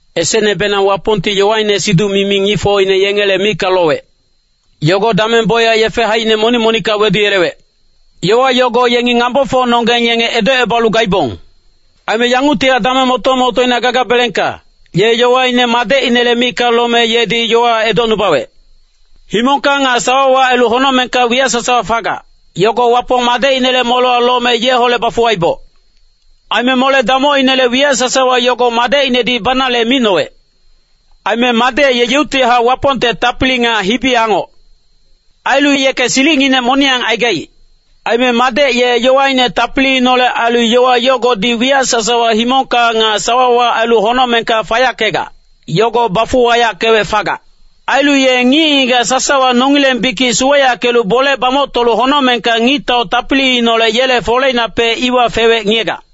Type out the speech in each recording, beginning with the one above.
Esecnebenang Wapongti yowaine siduc-mimi ngicfocine yengele micka lowec. Yogo dameng bocyac yefe haicine monic-monicka weduyelewec. Yowa yogo yengi ngambofocnonggeng yenge edocebalu gaibong. Aime yanguctihac dameng moto-motoina gagabelengka, ye yowaine Madecinele micka lome yedi yowa edocnubawec. Himongka nga sawawa ailu honocmengka wiyac sasawa fagac, yogo Wapong Madecinele molewa lome yeholec bafuwaiboc. Aime mole-damocinele wiyac sasawa yogo Madecinedi banale micnowec. Aime Madec ye yeuctihac Wapongte tapili nga hibi-angoc. Ailu yeke silicnginec moniyang aigaic. Aime Madec ye yowaine tapiliineholec ailu yowa yogodi wiyac sasawa himongka nga sawawa ailu honocmengka fayackegac, yogo bafuwayackewec fagac. Ailu ye ngic-ngigac sasawa nongileng bikic suweyackelu bole bamoctolu honocmengka Ngictau tapiliineholec yele foleinapec iwa fewec ngiyegac.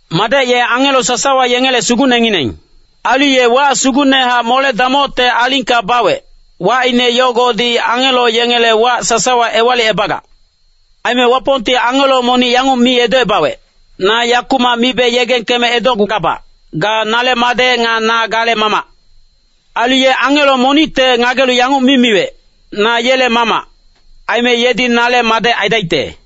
Madec ye angelo sasawa yengele sugucnengineng. Ailu ye wac sugucnehac mole-damocte alingka bawec, wacine yogodi angelo yengele wac sasawa ewalicebagac. Aime Wapongti angelo monic yanguc mi edocebawec, “Na yakumac mibe yegengkeme edocgugabac, ga nale Madec nga na gale Mamac.” Ailu ye angelo monicte ngagelu yanguc mi miwec, “Na yele Mamac, aime yedi nale Madec aidaicte.”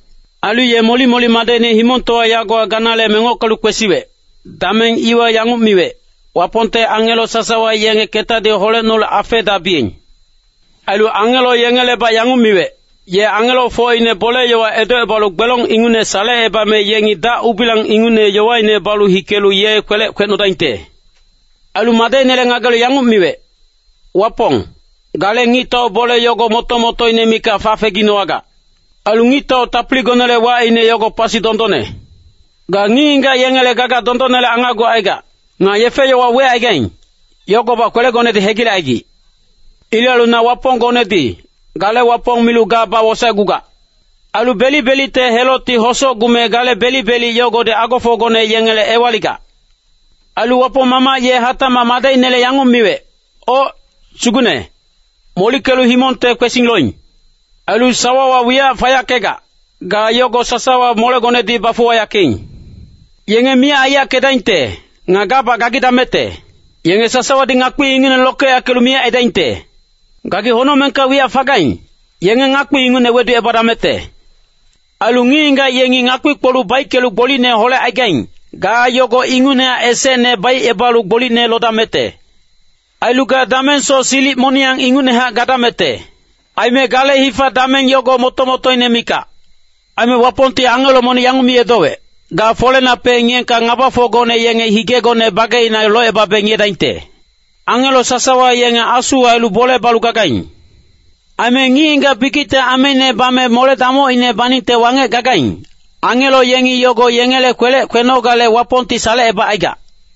Ailu ye molic-molic Madecine himongtowa yagowa ganale mengockelu kwesiwec, dameng iwa yanguc miwec, “Wapongte angelo sasawa yenge ketadi holecnolu afeedabiyeng.” Ailu angelo yengelebac yanguc miwec, “Ye angelofocine bole-yowa edocebalu gbelong ingucne salecebame yengi dac-ubilang ingucne yowaine balu hikelu ye kwelec kwecnodaingte.” Ailu Madecinele ngagelu yanguc miwec, “Wapong, gale ngictau bole yogo moto-motoine mikac fafeginowagac. Ailu ngictau tapiligonele wacine yogo pasi dondonne. Ga ngic-ngigac yengele gaga dondonnele angacgucaigac. Nga yefe-yowa wecaigaing, yogobac kwelegonedi hegilecaigic. Ilec ailu na Waponggonedi, gale Wapong milu ga bawosaecgugac. Ailu belic-belicte helocti hosocgume gale belic-belic yogodi agofocgone yengele ewaligac.” Ailu Wapong Mamac ye hatacmac Madecinele yanguc miwec, “Oc, Sugucne, molickelu himongte kwesing loing. Ailu sawawa wiyac fayackegac, ga yogo sasawa molegonedi bafuwayackeing. Yenge miyac aiyackedaingte nga gabac gagidamecte. Yenge sasawadi ngakpi ingucne lokeyackelu miyac aidaingte. Gagi honocmengka wiyac fagaing, yenge ngakpi ingucne weducebadamecte. Ailu ngic-ngigac yengi ngakpi-kpoluc baickelu gbolicne holecaigaing, ga yogo ingucnehac esecne baicebalu gbolicne lodamecte. Ailu ga damengsoc silic moniyang ingucnehac gadamecte. Aime gale hifa-dameng yogo moto-motoine mikac.” Aime Wapongti angelo monic yanguc mi edowec, “Ga folenapec ngiyeengka ngabafocgone yenge higegone bageina locebabe ngiyedaingte.” Angelo sasawa yenge asu ailu bole balu gagaing. Aime ngic-ngigac bikicte ameine bame mole-damocine baningte wangec gagaing, angelo yengi yogo yengele kwelec kwenogale Wapongti salecebacaigac.